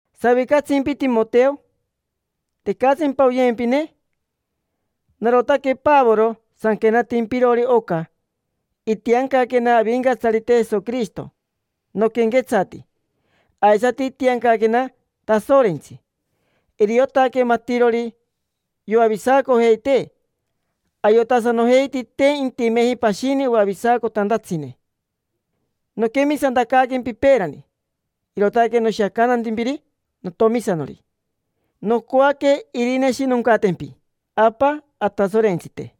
¿Savicatsimpi, Timoteo? ¿Tecatsimpa oyempine? Narotaque Pavoro sanquenatimpirori oca; itiancaquena Avincatsarite Jesoquirishito noquenquetsati, aisati itiancaquena Tasorentsi. Iriotaque matirori yoavisacojeitee, ayotasanojeiti te intimeji pashini oavisacotantatsine. Noquemisantacaaquempi peerani, irootaque noshiacantantimpiri notomisanori. Nocoaque irineshinoncatempi Apa Atasorentsite,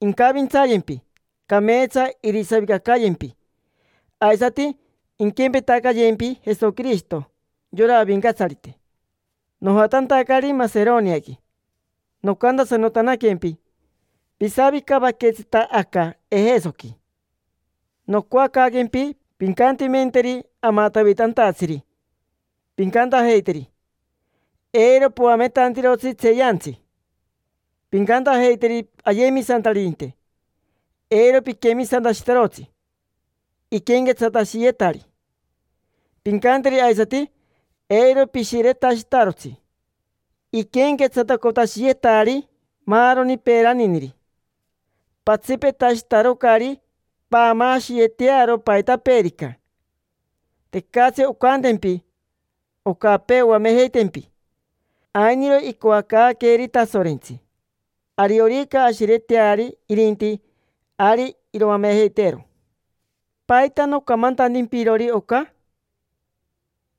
incavintsayempi, cameetsa irisavicacayempi. Aisati inquempetacayempi Jesoquirishito, yora Avincatsarite. Nojatantacari Maseroniaqui, nocantasanotanaquempi: “Pisavicavaquetsita aca Ejesoqui”. Nocoacaaquempi pincantimenteri amatavitantatsiri; pincantajeiteri: “Eiro poametantirotsi tseeyantsi”. Pincantajeiteri ayemisantaririnte: “Eiro piquemisantashitarotsi iquenquetsatashiyetari”. Pincanteri aisati: “Eiro pishiretashitarotsi iquenquetsatacotashiyeetari maaroni peeraniniri. Patsipetashitarocari paamaashiyetearo paitapeerica. Tecatsi oncantempi ocapee oamejeitempi. Ainiro icoacaaqueeri Tasorentsi: ariorica ashireteari irinti, ari iroamejeiteero”. ¿Paita nocamantantimpirori oca?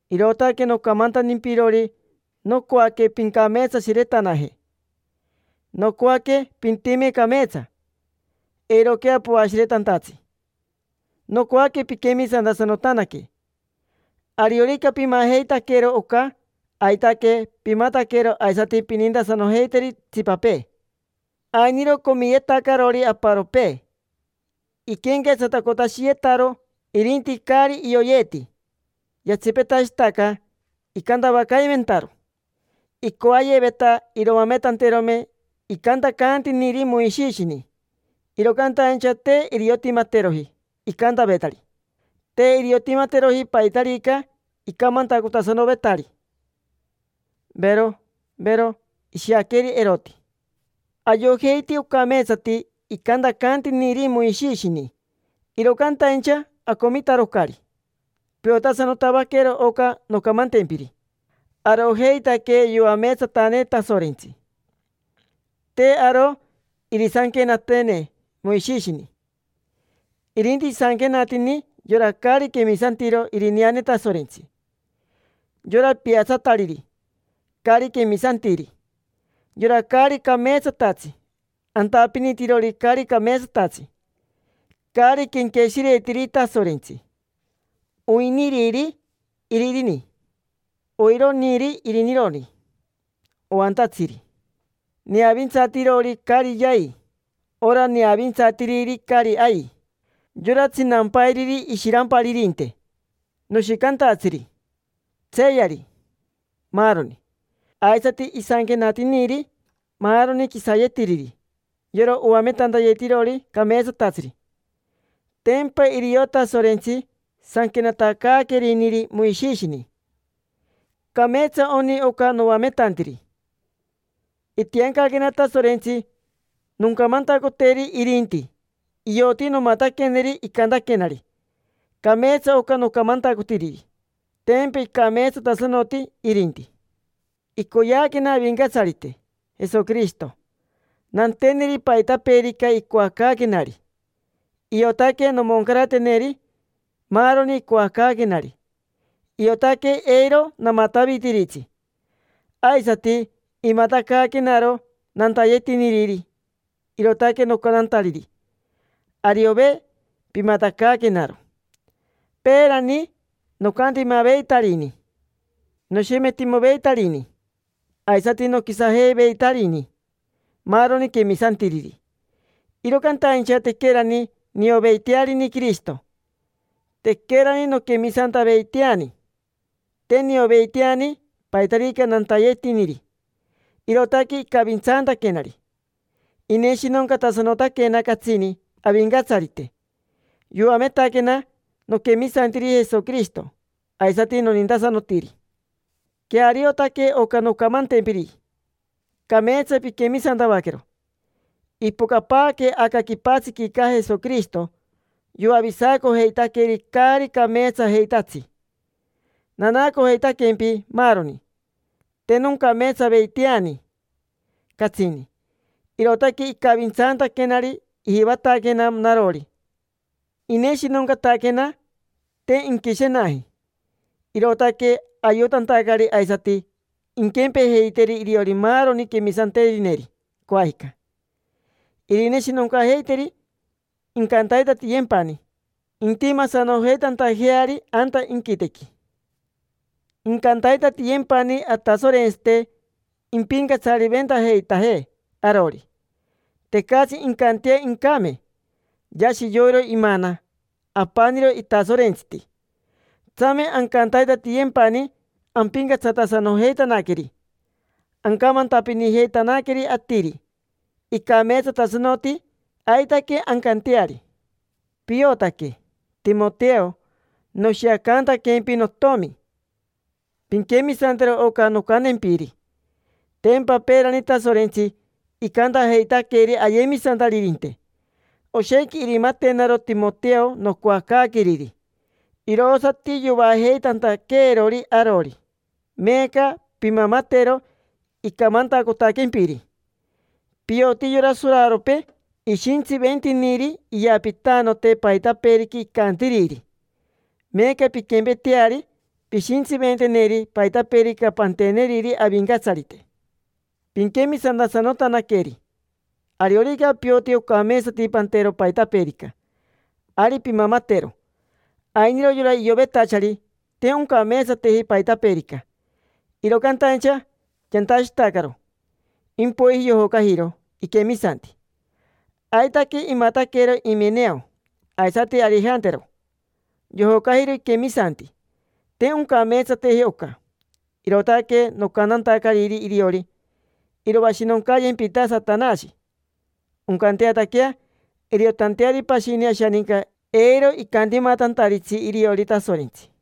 Irootaque nocamantantimpirori nocoaque pincameetsashiretanaje, nocoaque pintime cameetsa, eiroquea poashiretantatsi; nocoaque pinquemisantasanotanaque. Ariorica pimajeitaquero oca, aitaque pimataquero aisati pinintasanojeiteri itsipapee. Ainiro comiyetacarori aparopee, iquenquetsatacotashiyetaro irinti caari ioyeti, yatsipetashitaca icantavacaimentaro. Icoayeveta iroametanterome icantacantiniri Moishishini, iro cantaincha te iriotimateroji icantavetari. Te iriotimateroji paitarica icamantacotasanovetari, vero, vero: ishiaqueri eroti. Ayojeiti ocameetsati icantacantiniri Moishishini, iro cantaincha acomitarocari. Piotasanotavaquero oca noncamantempiri: arojeitaque yoameetsatane Tasorentsi, te aro irisanquenateene Moishishini. Irinti isanquenatini yora caari quemisantiro irineane Tasorentsi: yora piatsatariri, caari quemisantiri, yora caari cameetsatatsi, antapinitirori caari cameetsatatsi, caari quenqueshiretiri Tasorentsi, oiriniri iririni, oironiri irinironi, oantatsiri, neavintsatirori caari yai, ora neavintsatiriri caari ai, yora tsinampairiri ishiramparirinte, noshicantatsiri, tseeyari, maaroni. Aisati isanquenatiniri maaroni quisayetiriri yora oametantayetirori cameetsatatsiri. Tempa irio Tasorentsi sanquenatacaaqueriniri Moishishini. Cameetsa oni oca noametantiri. Itiancaquena Tasorentsi noncamantacoteri irinti, ioti nomataqueneri icantaquenari. Cameetsa oca nocamantacotiriri: tempa icameetsatasanoti irinti. Icoyeaquena Avincatsarite Jesoquirishito nanteneri paitapeerica icoacaaquenari. Iotaque nomoncarateneri maaroni icoacaaquenari: iotaque eiro namatavitiritsi. Aisati imatacaaquenaro nantayetiniriri, irootaque nocantantariri: “Ariove, pimatacaaquenaro”. Peerani nocantimaveitarini, noshemetimoveitarini, aisati noquisajeiveitarini maaroni quemisantiriri. Iro cantaincha tequerani nioveitearini Quirishito, tequerani nonquemisantaveiteani. Te nioveiteani paitarica nantayetiniri, irootaque icavintsantaquenari. Ineshinoncatasanotaquena catsini Avincatsarite: yoametaquena noquemisantiri Jesoquirishito, aisati nonintasanotiri. Queariotaque oca noncamantempiri, cameetsa pinquemisantavaquero. Ipocapaaque aca quipatsiquica Jesoquirishito yoavisacojeitaqueri caari cameetsajeitatsi. Nanaacojeitaquempi maaroni, te noncameetsaveiteani catsini. Irootaque icavintsaantaquenari, ijivataquena narori ineshinoncataquena, te inquishenaji. Irootaque ayotantacari aisati inquempejeiteri iriori maaroni quemisanterineri coajica: irineshinoncajeiteri, incantaitatiyempani intimasanojeitantajeari anta inquitequi. Incantaitatiyempani Atasorentsite impincatsariventajeitajee arori. Tecatsi incantea incame. Yashi yoiro imana. Apaniro itasorentsiti. Tsame ancantaitatiyempani ampincatsatasanojeitanaqueri, ancamantapinijeitanaqueri atiri icameetsatasanoti. Aitaque ancanteari. Piotaque, Timoteo, noshiacantaquempi notomi. Pinquemisantero oca noncantempiri. Tempa peerani Tasorentsi, icantajeitaqueri ayemisantaririnte: “Oshequi irimatenaro Timoteo nocoacaaqueriri”. Irosati yovaajeitantaqueerori arori. Meeca pimamatero icamantacotaquempiri. Pioti yora soraropee ishintsiventiniri iyapitanote paitapeerica icantiriri. Meeca, pinquempeteari, pishintsiventeneri paitapeerica panteneriri Avincatsarite, pinquemisantasanotanaqueri. Ariorica pioti ocameetsati pantero paitapeerica, ari pimamatero. Ainiro yora iovetachari te oncameetsateji paitapeerica, iro cantaincha yantashitacaro, impoiji yojocajiro iquemisanti. Aitaque imataquero Imeneo aisati Arijantero: yojocajiro iquemisanti. Te oncameetsateji oca, irootaque nocantantacariri iriori: “Iroashinoncayempita Satanashi”; oncanteataquea iriotanteari pashini ashaninca eiro icantimatantaritsi iriori Tasorentsi.